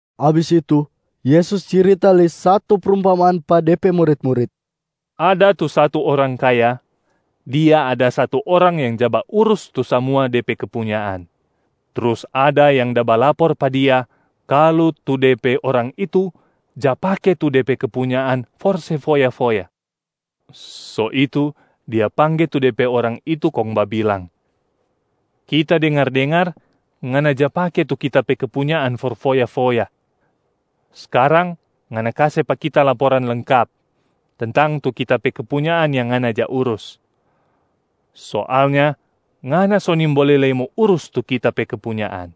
Abis itu Yesus cirita lei satu prumpamaan pa De pe murit-murit, “Ada tu satu orang kaya, dia ada satu orang yang ja baurus tu samua de pe kepunyaan. Trus ada yang da balapor pa dia kalu tu de pe orang itu ja pake tu de pe kepunyaan for se foya-foya. So itu dia pangge tu de pe orang itu kong babilang, ‘Kita dengar-dengar ngana ja pake tu kita pe kepunyaan for foya-foya. Skarang ngana kase pa kita laporan lengkap tentang tu kita pe kepunyaan yang ngana ja urus. Soalnya ngana so nimbole lei mo urus tu kita pe kepunyaan.’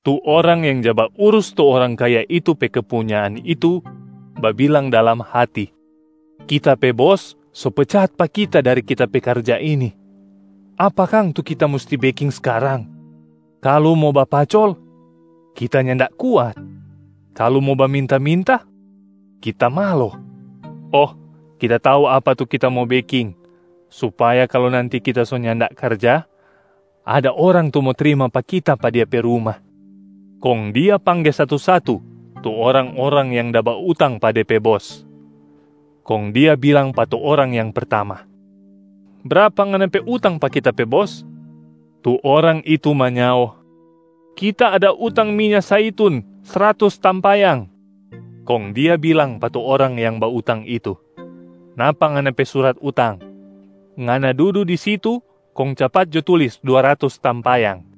Tu orang yang ja baurus tu orang kaya itu pe kepunyaan itu babilang dalam hati, ‘Kita pe bos so pecat pa kita dari kita pe karja ini. Apa kang tu kita musti beking skarang? Kalu mo bapacol, kita nyanda kuat. Kalu mo baminta-minta, kita malo. Oh, kita tau apa tu kita mo beking supaya kalu nanti kita so nyanda karja, ada orang tu mo trima pa kita pa dia pe ruma.’ Kong dia pangge satu-satu tu orang-orang yang da bautang pe de pe bos. Kong dia bilang pa tu orang yang pertama, ‘Brapa ngana pe utang pa kita pe bos?’ Tu orang itu manyao, ‘Kita ada utang minya zaitun sratus tampayang.’ Kong dia bilang pa tu orang yang bautang itu, ‘Napa ngana pe surat utang. Ngana dudu di situ kong capat jo tulis dua ratus tampayang.’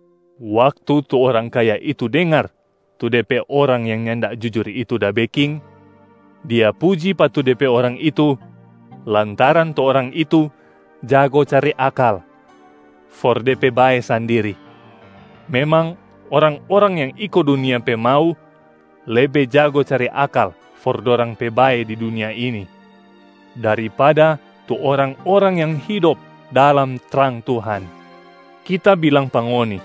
Waktu tu orang kaya itu dengar tu de pe orang yang nyanda jujur itu da beking, dia puji pa tu de pe orang itu lantaran tu orang itu jago cari akal for de pe bae sandiri. Memang orang-orang yang iko dunia pe mau lebe jago cari akal for dorang pe bae di dunia ini daripada tu orang-orang yang hidop dalam trang Tuhan. Kita bilang pa ngoni,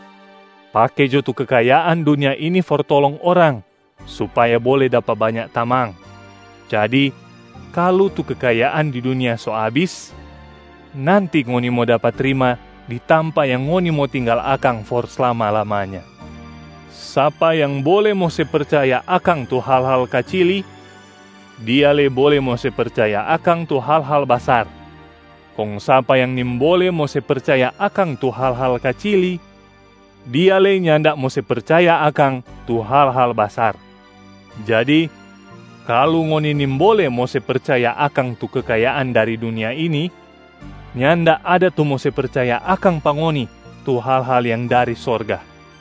pake jo tu kekayaan dunia ini for tolong orang supaya bole dapa banya tamang. Jadi kalu tu kekayaan di dunia so abis, nanti ngoni mo dapa trima di tampa yang ngoni mo tinggal akang for slama-lamanya. Sapa yang bole mo se percaya akang tu hal-hal kacili, dia lei bole mo se percaya akang tu hal-hal basar. Kong sapa yang nimbole mo se percaya akang tu hal-hal kacili, dia lei nyanda mo se percaya akang tu hal-hal basar. Jadi, kalu ngoni nimbole mo se percaya akang tu kekayaan dari dunia ini, nyanda ada tu mo se percaya akang pa ngoni tu hal-hal yang dari sorga.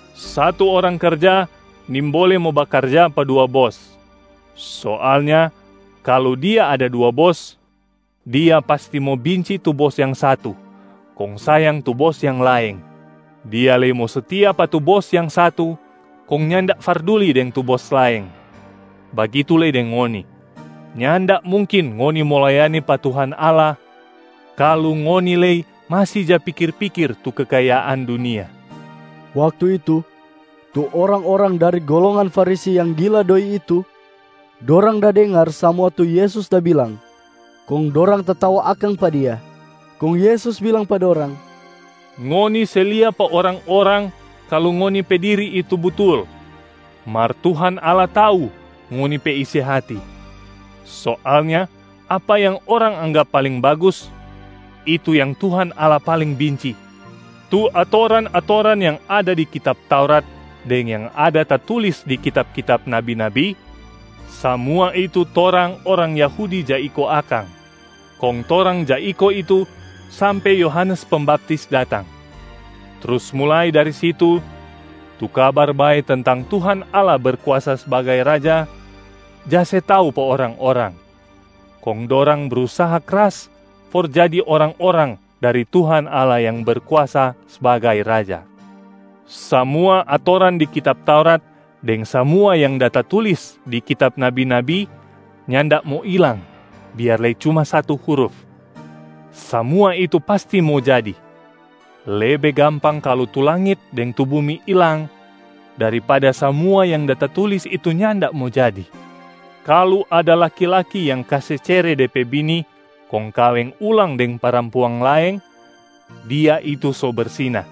Satu orang karja nimbole mo bakarja pa dua bos. Soalnya kalu dia ada dua bos, dia pasti mo binci tu bos yang satu kong sayang tu bos yang laeng, dia lei mo setia pa tu bos yang satu kong nyanda farduli deng tu bos laeng. Bagitu lei deng ngoni, nyanda mungkin ngoni mo layani pa Tuhan Allah kalu ngoni lei masi ja pikir-pikir tu kekayaan dunia.” Waktu itu, tu orang-orang dari golongan Farisi yang gila doi itu, dorang da dengar samua tu Yesus da bilang, kong dorang tatawa akang pa Dia. Kong Yesus bilang pa dorang, “Ngoni se lia pa orang-orang kalu ngoni pe diri itu butul, mar Tuhan Allah tau ngoni pe isi hati. Soalnya apa yang orang anggap paling bagus, itu yang Tuhan Allah paling binci. Tu atoran-atoran yang ada di kitab Taurat deng yang da tatulis di kitab-kitab nabi-nabi, samua itu torang orang Yahudi ja iko akang, kong torang ja iko itu sampe Yohanes Pembaptis datang. Trus mulai dari situ, tu Kabar Bae tentang Tuhan Allah Berkuasa sbagai Raja ja se tau pa orang-orang, kong dorang brusaha kras for jadi orang-orang dari Tuhan Allah yang Berkuasa sbagai Raja. Samua atoran di kitab Taurat deng samua yang da tatulis di kitab nabi-nabi nyanda mo ilang biar lei cuma satu huruf, samua itu pasti mo jadi. Lebe gampang kalu tu langit deng tu bumi ilang daripada samua yang da tatulis itu nyanda mo jadi. Kalu ada laki-laki yang kase cere de pe bini kong kaweng ulang deng parampuang laeng, dia itu so bersina.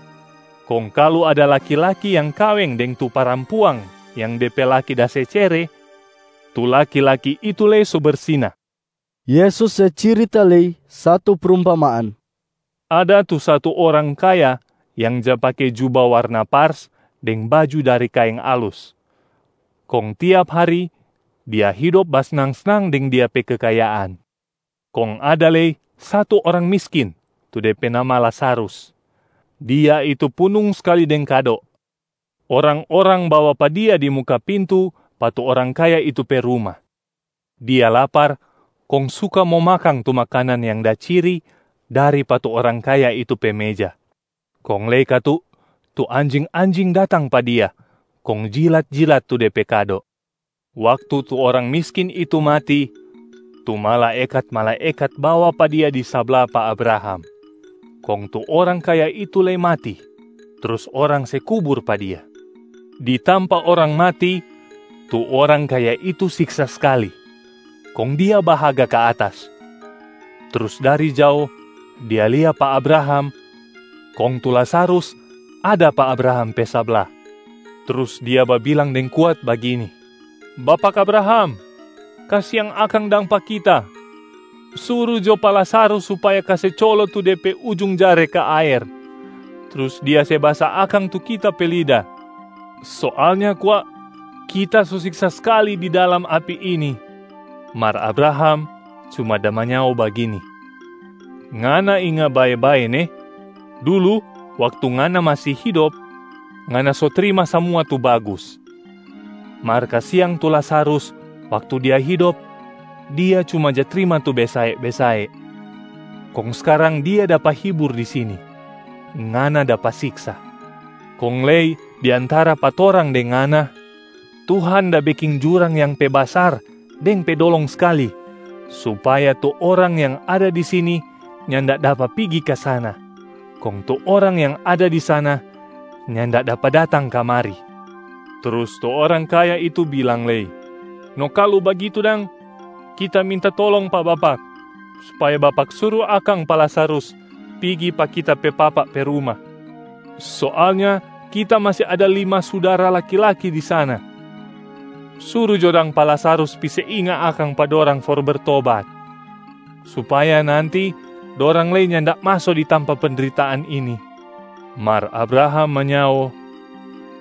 Kong kalu ada laki-laki yang kaweng deng tu parampuang yang de pe laki da se cere, tu laki-laki itu lei so bersina.” Yesus se cirita lei satu prumpamaan, “Ada tu satu orang kaya yang ja pake juba warna pars deng baju dari kaeng alus. Kong tiap hari dia hidop basnang-snang deng dia pe kekayaan. Kong ada lei satu orang miskin tu de pe nama Lazarus. Dia itu punung skali deng kado. Orang-orang bawa pa dia di muka pintu pa tu orang kaya itu pe ruma. Dia lapar kong suka mo makang tu makanan yang da ciri dari pa tu orang kaya itu pe meja. Kong lei katu tu anjing-anjing datang pa dia kong jilat-jilat tu de pe kado. Waktu tu orang miskin itu mati, tu malaekat-malaekat bawa pa dia di sabla pa Abraham. Kong tu orang kaya itu lei mati trus orang se kubur pa dia. Di tampa orang mati, tu orang kaya itu siksa skali. Kong dia bahaga ka atas, trus dari jao dia lia pa Abraham kong tu Lazarus ada pa Abraham pe sabla. Trus dia babilang deng kuat bagini, ‘Bapak Abraham, kasiang akang dang pa kita. Suru jo pa Lazarus supaya kase colo tu de pe ujung jare ka aer, trus dia se basa akang tu kita pe lida. Soalnya kwa kita so siksa skali di dalam api ini.’ Mar Abraham cuma da manyao bagini, ‘Ngana inga bae-bae ne, dulu waktu ngana masi hidop, ngana so trima samua tu bagus. Mar kasiang tu Lazarus waktu dia hidop, dia cuma ja trima tu besae-besae. Kong skarang dia dapa hibur di sini, ngana dapa siksa. Kong lei di antara pa torang deng ngana, Tuhan da beking jurang yang pe basar deng pe dolong skali, supaya tu orang yang ada di sini nyanda dapa pigi ka sana, kong tu orang yang ada di sana nyanda dapa datang kamari.’ Trus tu orang kaya itu bilang lei, ‘No kalu bagitu dang, kita minta tolong pa bapak supaya bapak suru akang pa Lazarus pigi pa kita pe papa pe ruma. Soalnya kita masi ada lima sudara laki-laki di sana. Suru jo dang pa Lazarus pi se inga akang pa dorang for bertobat, supaya nanti dorang lei nyanda maso di tampa pendritaan ini.’ Mar Abraham manyao,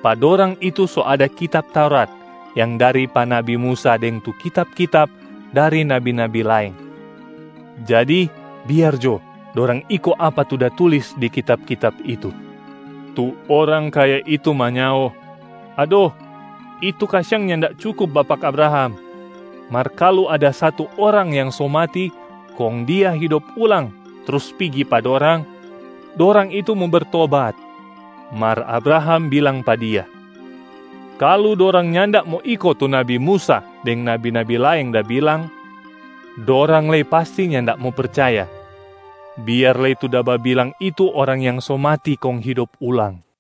‘Pa dorang itu so ada kitab Taurat yang dari pa nabi Musa deng tu kitab-kitab dari nabi-nabi laeng. Jadi biar jo dorang iko apa tu da tulis di kitab-kitab itu.’ Tu orang kaya itu manyao, ‘Ado, itu kasiang nyanda cukup bapak Abraham. Mar kalu ada satu orang yang so mati kong dia hidop ulang trus pigi pa dorang, dorang itu mo bertobat.’ Mar Abraham bilang pa dia, ‘Kalu dorang nyanda mo iko tu nabi Musa deng nabi-nabi laeng da bilang, dorang lei pasti nyanda mo percaya, biar lei tu da babilang itu orang yang so mati kong hidop ulang.’”